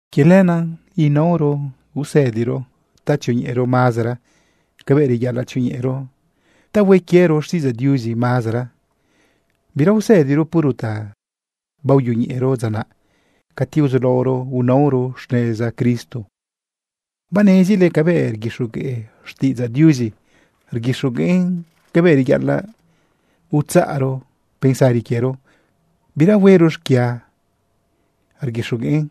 Quie lenaꞌ huero seguir usëdiro ta tzioñeꞌero mazara cabëꞌ reyaꞌalaꞌ tzioñeꞌero ta hue quiero xtiꞌidzaꞌ Diuzi mazara. Bira usëdiro puro ta baoyoñeꞌero dza naꞌ cati uzulaoro unaoro xneza Cristo. Banezile cabëꞌ rguixogueꞌ xtiꞌidzaꞌ Diuzi, rguixogueꞌn cabëꞌ reyaꞌalaꞌ utzaꞌro pensari quiero bira huero xquia, rguixogueꞌn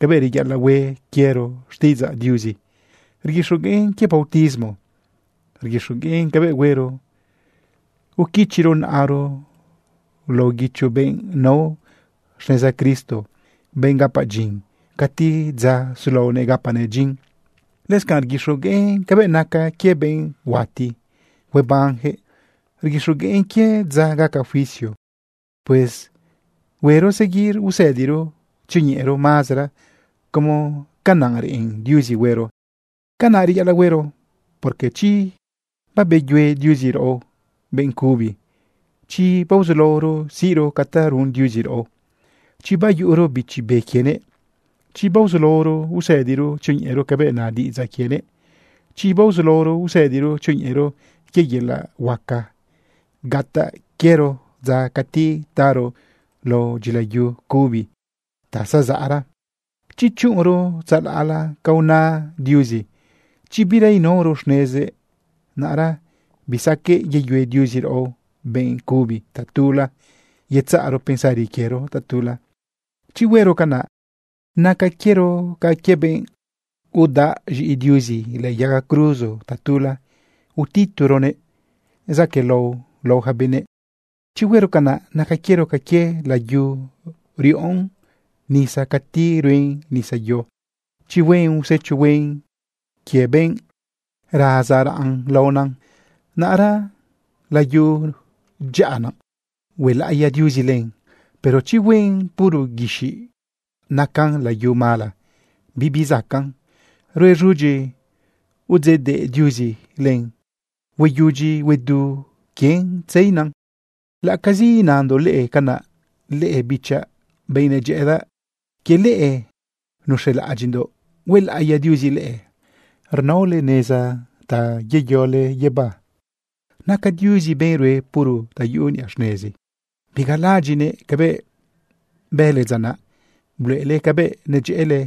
cabëꞌ reyaꞌalaꞌ hue quiero xtiꞌidzaꞌ Diuzi, rguixogueꞌn quie bautismo, rguixogueꞌn cabëꞌ huero uquichiro naꞌaro lao guicho benꞌ nao xneza Cristo, benꞌ gapa dyin cati dza sulaonëꞌ gapanëꞌ dyin. Lëscanꞌ rguixogueꞌn cabëꞌ naca quie benꞌ huati huebanjëꞌ, rguixogueꞌn quie dza gaca juicio. Pues huero seguir usëdiro tzioñeꞌero mazara como canaꞌ reꞌen Diuzi huero. Canaꞌ reyaꞌalaꞌ huero, porque chi babeyue Diuzi raꞌo benꞌ cubi, chi baozulaoro siꞌro ca ta run Diuzi raꞌo, chi bayuꞌuro Bichi Be quienëꞌ, chi baozulaoro usëdiro tzioñeꞌero cabëꞌ na diꞌidzaꞌ quienëꞌ, chi baozulaoro usëdiro tzioñeꞌero quie yelaꞌ huaca gataꞌ quiero dza cati taro lao dyila yu cubi ta zazaꞌra, chi chuꞌunro tzalaꞌla ca una Diuzi, chi bira inaoro xnezëꞌ, naꞌra bisaqueꞌ yeyue Diuzi raꞌo benꞌ cubi tatula yetzaꞌro pensari quiero tatula. Chi huero canaꞌ, naca quiero ca quie benꞌ udaꞌ z̃iꞌi Diuzi lëꞌë yaga cruzo tatula, utitoronëꞌ zaquëꞌlao lao ja benëꞌ. Chi huero canaꞌ, naca quiero ca quie layu riꞌon nisa cati ruen nisayo. Chi hueꞌn usecho huen quie benꞌ raza raꞌn laona, naꞌra layu dyaꞌa naꞌ, huelaꞌiya Diuzi len. Pero chi hueꞌn puro guixiꞌ, nacan layu mala bibi zacaꞌn. Ruen z̃udyi udzeꞌdeꞌ Diuzi len, hueyudyi huedu quien tzeina. Laꞌ acazi inandoꞌ leꞌe canaꞌ, leꞌe bichaꞌ, benꞌ nedyëꞌëdaꞌ, quie leꞌe nuz̃elaꞌadyiꞌndoꞌ huelaꞌiya Diuzi leꞌe, rnaole neza ta yeyole guibá. Naca Diuzi benꞌ rue puro ta yuꞌu niꞌa xnezi. Bigalaꞌadyiꞌnëꞌ cabëꞌ bële dza naꞌ bluꞌele cabëꞌ nedyëꞌële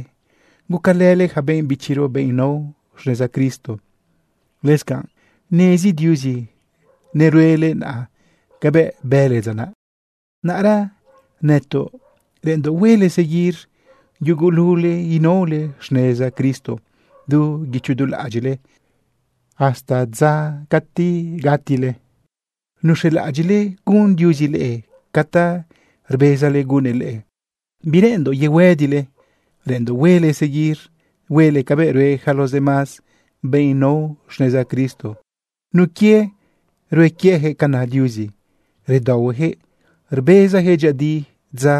gucalële ja benꞌ bichiro, benꞌ nao xneza Cristo. Lëscanꞌ nezi Diuzi neruele naꞌa cabëꞌ bële dza naꞌ. Naꞌra nëtoꞌ reꞌenndoꞌ huele seguir yugulule inaole xneza Cristo du guicho du laꞌadyiꞌle hasta dza cati gatile nuz̃elaꞌadyiꞌle gun Diuzi leꞌe ca ta rbezale gunnëꞌ leꞌe. Bireꞌenndoꞌ yehuëdile, reꞌenndoꞌ huele seguir huele cabëꞌ rue yaca los demás benꞌ nao xneza Cristo. Nun quie rue quiejëꞌ ca na Diuzi, redaohuejëꞌ rbezajëꞌ dyëꞌëdi dza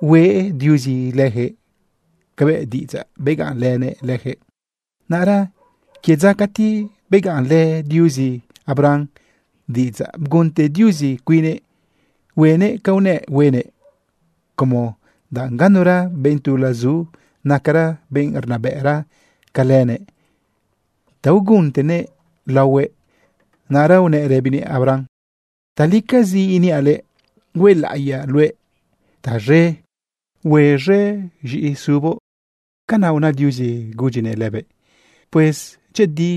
hueꞌ Diuzi lëjëꞌ cabëꞌ diꞌidzaꞌ begaꞌnlënëꞌ lëjëꞌ. Naꞌra quie dza cati begaꞌnlë Diuzi Abraham diꞌidzaꞌ, bgunte Diuzi cuinnëꞌ huenëꞌ ca unëꞌ huenëꞌ, como danꞌ ganura benꞌ tula zu nacara benꞌ rnabëꞌra ca lëbëꞌ ta uguntënëꞌ laohue. Naꞌra unëꞌ rëbinëꞌ Abraham: “Talicazi iniaꞌ luëꞌ, huelaꞌiyaꞌ luëꞌ taz̃e, huez̃e z̃iꞌisuboꞌ.” Canaꞌ una Diuzi gudyinëꞌ lëbëꞌ. Pues dyëꞌëdi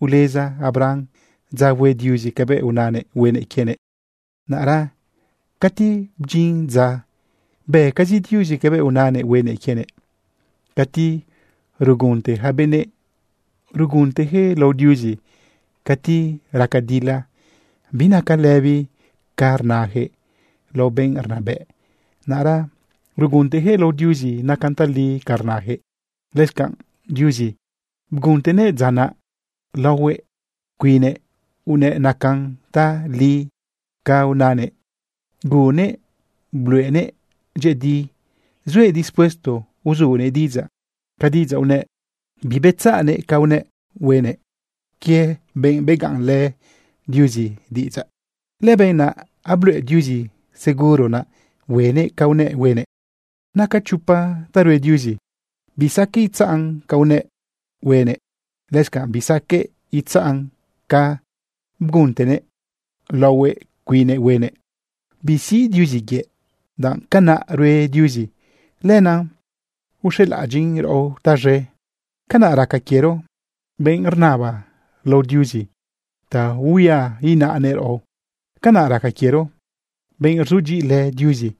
uleza Abraham dza hue Diuzi cabëꞌ unanëꞌ huenëꞌ quienëꞌ. Naꞌra cati bdyin dza, bëcazi Diuzi cabëꞌ unanëꞌ huenëꞌ quienëꞌ. Cati rugunte ja benëꞌ, ruguntejëꞌ lao Diuzi. Cati raca dila binaca lëbi ca rnajëꞌ lao benꞌ rnabëꞌ, naꞌra ruguntejëꞌ lao Diuzi nacan tali ca rnajëꞌ. Lëscanꞌ Diuzi, bguꞌuntenëꞌ dza naꞌ laohuëꞌ cuinnëꞌ unëꞌ nacan tali ca unanëꞌ. Guꞌunnëꞌ bluꞌenëꞌ dyëꞌëdi zuëꞌ dispuesto uzunëꞌ diꞌidzaꞌ ca diꞌidzaꞌ unëꞌ, bibetzaꞌnëꞌ ca unëꞌ huenëꞌ. Quie benꞌ begaꞌnlë Diuzi diꞌidzaꞌ, lëbenꞌ naꞌ abluꞌe Diuzi seguro naꞌ huenëꞌ ca unëꞌ huenëꞌ. Naca chopa ta rue Diuzi bisaqueꞌ itzaꞌn. Bisaqueꞌ itzaꞌn ca unëꞌ huenëꞌ. Lëscanꞌ bisaqueꞌ itzaꞌn ca bguꞌuntenëꞌ laohuëꞌ cuinnëꞌ huenëꞌ. Bisiꞌ Diuzi yëꞌ. Danꞌ canaꞌ rue Diuzi, lenaꞌ uxelaꞌadyiꞌn raꞌo taz̃e. Canaꞌ raca quiero, benꞌ rnaba lao Diuzi, ta huia inaꞌnëꞌ raꞌo. Canaꞌ raca quiero, benꞌ rzudyiꞌilë Diuzi,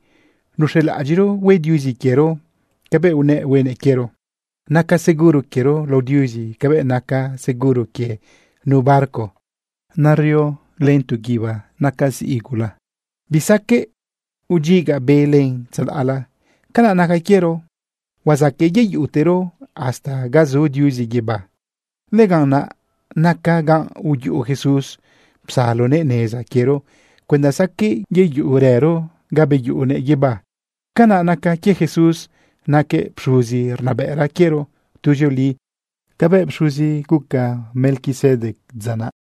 nuz̃elaꞌadyiꞌro hue Diuzi quiero cabëꞌ unëꞌ huenëꞌ quiero. Naca seguro quiero lao Diuzi cabëꞌ naca seguro quie nu barco nerio len tu guíba naca ziꞌi gula, bisaqueꞌ udyiga be len tzalaꞌla. Canaꞌ naca quiero huazaqueꞌ yeyuꞌutero hasta ga zu Diuzi guibá. Lëganꞌ naꞌ naca ga uyuꞌu Jesús, psalonëꞌ neza quiero cuenda saqueꞌ yeyuꞌurëro ga beyuꞌunëꞌ guibá. Canaꞌ naca quie Jesús, naquëꞌ pxuzi rnabëꞌra quiero tuzioli cabëꞌ pxuzi guca Melquisedec dza naꞌ.